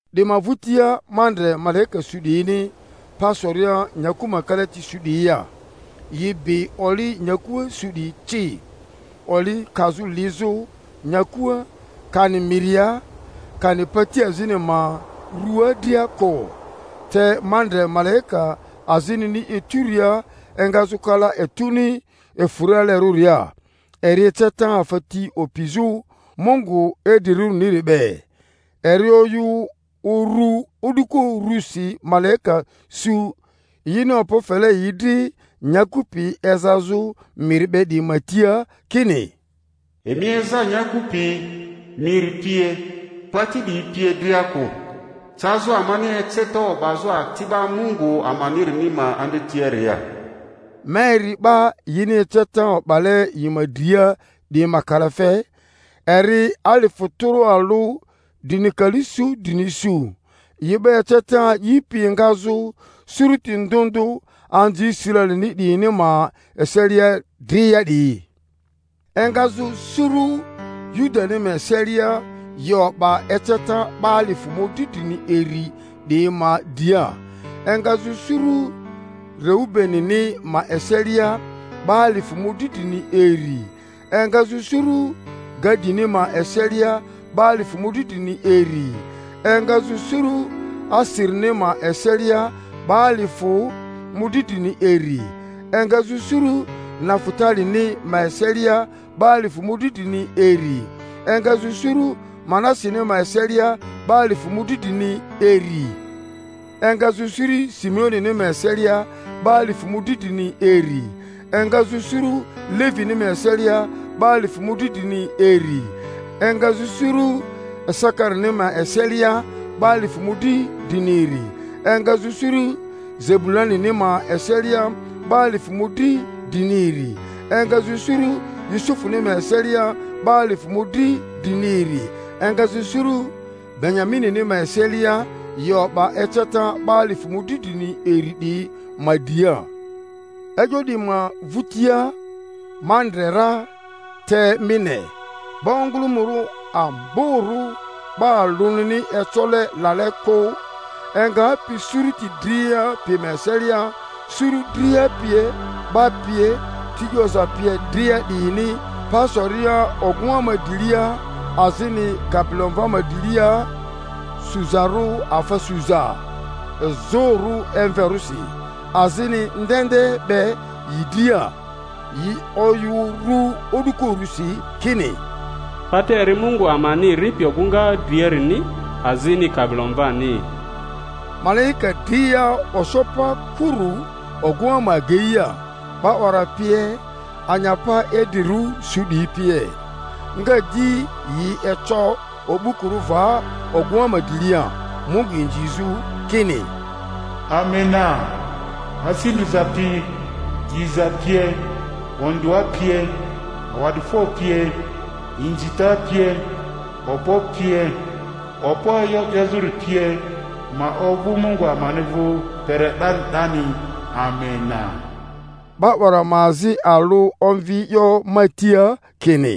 Di ma vᴜtia ma ndre malaika su 'diyini pa soria nyaku ma kalati su 'diyia, yi bi oli nyakua su 'diyi ci, oli kazᴜ lizᴜ nyakua, kani miria, kani pati azini ma rᴜaa dria kᴜ. Te ma ndre malaika azinini eturia engazᴜ kala etuni efᴜrialerᴜria, eri eceta afa ti opizᴜ Mungu idrirᴜriniri be; eri oyᴜ uru o'duko urusi malaika su yini okpo fele yi dri nyaku pi ezazᴜ miri be 'diyi ma tia, kini, Emi eza nyaku pi, miri pie, pati 'diyi pie dria kᴜ, cazᴜ amani eceta o'bazᴜ ati'ba Mungu amanirini ma andretiaria. Ma eri 'ba yini eceta o'bale yi ma dria 'diyi ma kalafe, eri alifᴜ tᴜrᴜ alᴜ drini kali su drini su, yi 'ba eceta a'ipi engazᴜ suruti ndᴜ ndᴜ anzi Israelini 'diyini ma eselia dria 'diyi: engazᴜ suru Yudani ma eselia yi o'ba eceta 'ba alifᴜ mᴜdri drini iri 'diyi ma dria, engazᴜ suru Reubenini ma eselia 'ba alifᴜ mᴜdri drini iri, engazᴜ suru Gadini ma eselia 'ba alifᴜ mᴜdri drini iri, engazᴜ suru Aserini ma eselia 'ba alifᴜ mᴜdri drini iri, engazᴜ suru Nafutalini ma eselia 'ba alifᴜ mᴜdri drini iri, engazᴜ suru Manaseni ma eselia 'ba alifᴜ mᴜdri drini iri, engazᴜ suru Simeonini ma eselia 'ba alifᴜ mᴜdri drini iri, engazᴜ suru Levini ma eselia 'ba alifᴜ mᴜdri drini iri, engazᴜ suru Isakarini ma eselia 'ba alifᴜ mᴜdri drini iri, engazᴜ suru Zebulunini ma eselia 'ba alifᴜ mᴜdri drini iri, engazᴜ suru Yusufuni ma eselia 'ba alifᴜ mᴜdri drini iri, engazᴜ suru Benyaminini ma eselia yi o'ba eceta 'ba alifᴜ mᴜdri drini iri 'diyi ma dria. E'yo 'diyi ma vᴜtia ma ndre ra, te mi ne, 'ba ongᴜlᴜmᴜrᴜ amborᴜ 'ba alᴜnini ecole lale kᴜ, engapi suruti dria pi ma eselia, suru dria pie, 'ba pie, ti 'yoza pie dria 'diyini pa soria ogᴜŋa ma drilia azini Kabilomva ma drilia, suzarᴜ afa suza izᴜrᴜ emverᴜsi, azini ndende be yi dria; yi oyᴜ urᴜ o'duko urusi kini, Pata eri Mungu amani ripi ogᴜŋa driarini azini Kabilomvani! Malaika dria oso pa kurᴜ ogᴜŋa ma ageia, 'ba 'wara pie, anyapa idrirᴜ su 'diyi pie; nga di yi eco o'bukurᴜ va ogᴜŋa ma drilia Mungu inzizᴜ, kini, Amena! Asi ndriza pi. diza pie, ondᴜa pie, awa'difo pie, inzita pie, okpo pie, okpo e'yo 'yezᴜri pie, ma ovᴜ Mungu amani vᴜ kpere 'dani 'dani! Amena. 'Ba 'wara ma azi alᴜ omvi e'yo ma tia, kini,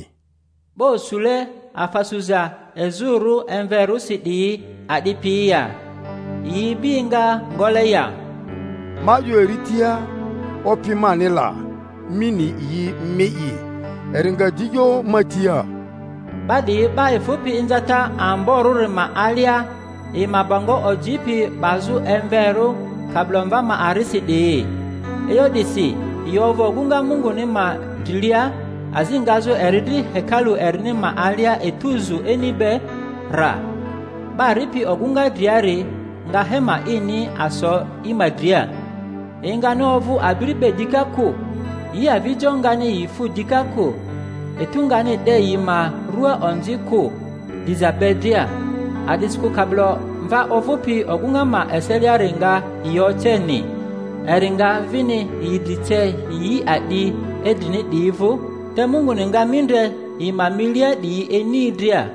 'Ba osule afa suza izᴜrᴜ emverᴜsi 'diyi a'di piyi ya, yi ibi enga ngole ya? Ma 'yo eri tia, Opi mani la, mi ni yi mi'i. Eri nga di 'yo ma tia, Ba 'diyi 'ba efᴜpi inzata amborᴜri ma alia, yi ma bongo ojipi 'bazᴜ emverᴜ Kabilomva ma arisi 'diyi. E'yo 'disi yi ovᴜ ogᴜŋa Munguni ma drilia, azi ngazᴜ eri dri hekalu erini ma alia etu zu ini be rra; 'ba ripi ogᴜna driari nga hema ini aso yi ma dria. Yi ngani ovᴜ abiri be dika kᴜ, yi avijo ngani yi fu dika kᴜ; etu ngani 'de yi ma rᴜaa onzi kᴜ, driza be dria. A'disikᴜ Kabilomva ovᴜpi ogᴜŋa ma eseliari nga yi oceni, eri nga vini yi dri ce yi a'di idrini 'diyi vᴜ; te Munguni nga mindre yi ma inilia 'diyi ini dria.